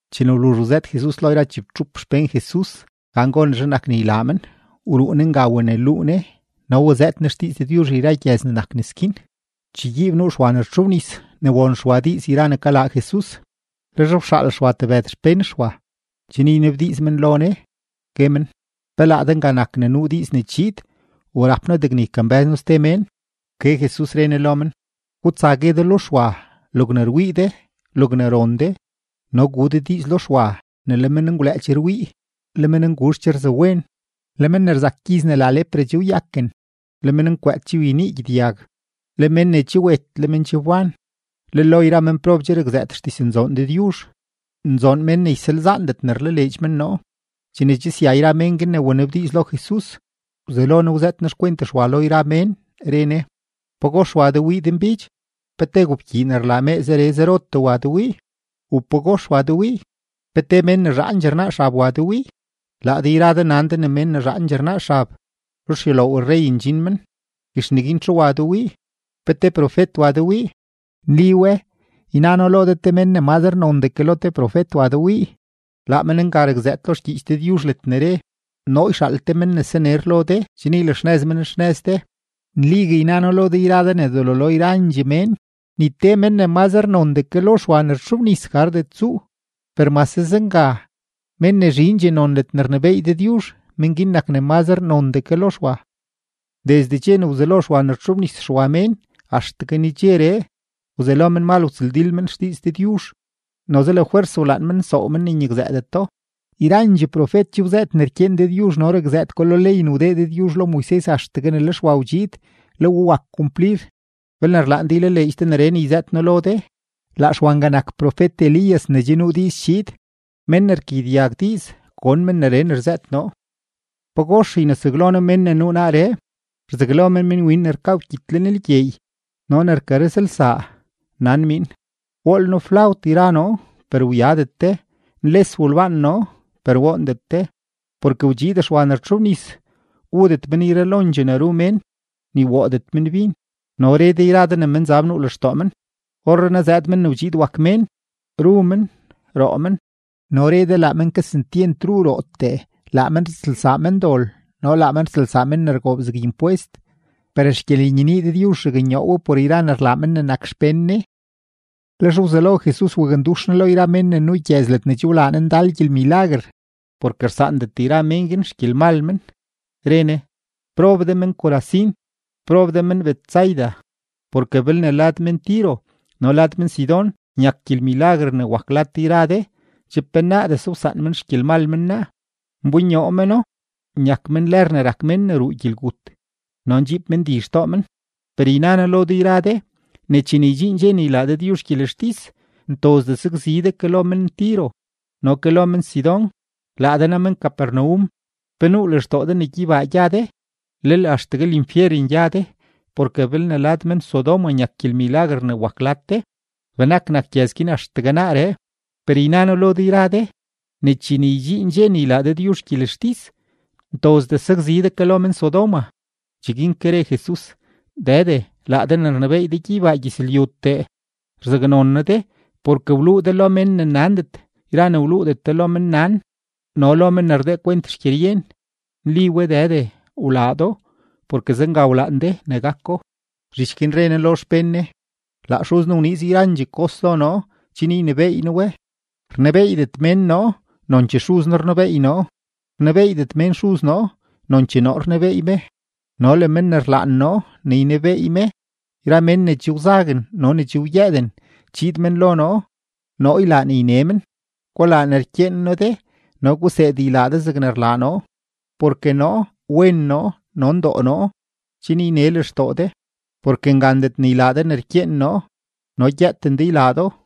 Chene wluzh wzëët Jesus lo yra chibtxup xpén Jesus gan gonezhe nak ne ylaa men, wruu Ne nga waneluu Ne no wazëët Ne xdiiz Dëdyuzh yra gyëz ne nak nes guin. Chegyiib nuu Xwa ne rtxobnis ne won Xwa diiz yra ne kalaa Jesus, lex wxaal Xwa tebëd xpén Xwa, chen ynabdiiz men lo Ne, gue men: ―¿Pe laa de nga nak ne nuu diiz ne chiid u rap noo degne ykambë́z noo ste mén? Wke Jesus, re Ne lo men: ―Gutsa gue de lo Xwa logne rwii de, logne ron de. No gu de diiz lo Xwa ne le menngwlëë che rwii, le mennguzh che rzawen, le men ne rzak gyiz ne la lepra che wyaken, le mennkwëët che wyenii gyedyag, le men ne che wet le men che wban, le lo yra menprob che rakzëët xdiznzoon Dëdyuzh. Nzoon men ne ysalzaandet ne rlaleedx men noo. Chene che sya yra mén guin ne wanabdiiz lo Jesus, wzelo Ne wzëët Ne xkwent Xwa lo yra mén, re Ne: ―¿Pagox wa de wii denbidx? ¿Pe te gobkyii ne rlaa mee zere zerotee wa de wii? ¿U pagox wa de wii? ¿Pe te mén ne zhaandxee rnaa xab wa de wii? Laa de yra de nan de ne men ne zhaandxee rnaa xab ruxyuloow rrey ndxin men. Guex neguin, ¿txu wa de wii? ¿Pe te profet wa de wii? Nli we, yna noo lo de, te men ne mazre nondee ke lo te profet wa de wii. Laa men nga rakzëët lo xgyiich Dëdyuzh ledne re: Noo yxaal te mén ne saner lo de chen ylaxnëz men xnëz de. Nligue yna noo lo de yra de ne delo lo yrandxee mén, ni te men ne mazre nondee ke lo Xwa ne rtxobnis gardet tsuu; per mase zenga, mén ne zhindxee non ledne rnebééy Dëdyuzh, men guin nak ne mazre nondee ke lo Xwa. ’Desde dxe ne wzelo Xwa ne wtxobnis Xwa mén axtegue nedxeree, wzelo menmal wtsëldil men xdiiz Dëdyuzh, noze lafwers wlaan men nsoow men ne nyakzëëdeto. Yrandxee profet che wzëët ne rkyeen Dëdyuzh no rakzëët ko lo ley ne wdee Dëdyuzh lo Moises axtegue ne le Xwa wdxiid, le we wak kumplir. Belne rlaan de ylaleedx de neree ne yzëët noo lo de, laa Xwa nga nak profet-Elías ne che nuu diiz chiid. Men ne rkagyedyag diiz, gon men neree ne rzëët noo. ’¿Pagox ynesaglo noo mén ne nuu naaree? Rzaglo men minwin ne rkaa wkyit lenlgyeey no ne rkarëzlsaa, nan miin: “Wool noo flawt yra noo, per wyadet de. Nles wolbaan noo, per woondet de.” Porke wdxiid Xwa ne rtxobnis, wudet men yralondxee ne ru mén, ni woodet men bin, no re de yra de ne menzab nuu lextoo men. Orrenaa zëëd Men ne wdxiid wak Mén, ru men, roo men, no re de, laa men kesentyent ru rootee, laa men rtsëlsaa mendol no laa men rtsëlsaa men ne rgoob zeg impwest. Per xgyelenyenii Dëdyuzh raknyoo we por yra ne rlaa mén ne nak xpén Ne. Lex wzelo Jesus wakndux Ne lo yra mén ne nuu gyëz ledne che wlaa Ne ndal gyelmilaguer, porke rsaandet yra men guin xgyelmal men, re Ne: ―¡Prob de men-Corazín! ¡Prob de men-Betsaida! Porke belne lad men-Tiro no le lad men-Sidón nyak gyelmilaguer ne wak lad de yra de, che penaadese wsaan men xgyelmal men naa, nbonyoo meno nyak men lër ne rak mén ne ruu gyelgut no ndxiib men di xtoo men. Per yna noo lo de yra de ne chene ydxiin dxe ne ylaa Dëdyuzh gyelextis, ntozdee sakzi de ke lo men-Tiro no ke lo men-Sidón. Laa de naa men-Capernaum, ¿pe nuu lextoo de ne gyeybaa gya de? ¡Lel axtegue linfyeren gya de! Porke belne lad men-Sodoma nyak gyelmilaguer ne wak lad de, benak nak gyëz guin axtegue naaree. Per yna noo lo de yra de ne chene ydxiin dxe ne ylaa Dëdyuzh gyelextis, ntozdee sakzi de ke lo men-Sodoma. Cheguin ke re Jesus: ―Dëde, laa de ne rnebééy de gyeybaa gyëzlyutee, rzaknon noo de porke wluu de lo men ne nandet yra ne wluudet de lo mennan no lo men ne rdee kwent xgyeryen. Nli we Dëde, wlaa do, porke zenga wlaan de ne gako. Zhich guin re Ne lo xpén Ne: ―Laa Xuz noo wniiz yrandxee kos lo noo chen ynebééy noo we. Rnebeeydet mén noo, nonchee Xuz noo rnebeey noo; rnebeeydet mén Xuz noo, nonchee noo rnebeey me, no le men ne rlaan noo ne ynebeey me. Yra men ne che wzaguen no ne che wyëëden, chiid men lo noo, noo ylaa ne yne men. Gulaa ne rkyeen noo de no guseed ylaa de zegne rlaa noo, porke noo wen noo no ndoo noo, chen yne lextoo de. Porke ngandet ne ylaa de ne rkyeen noo, no gyëëten de ylaa do.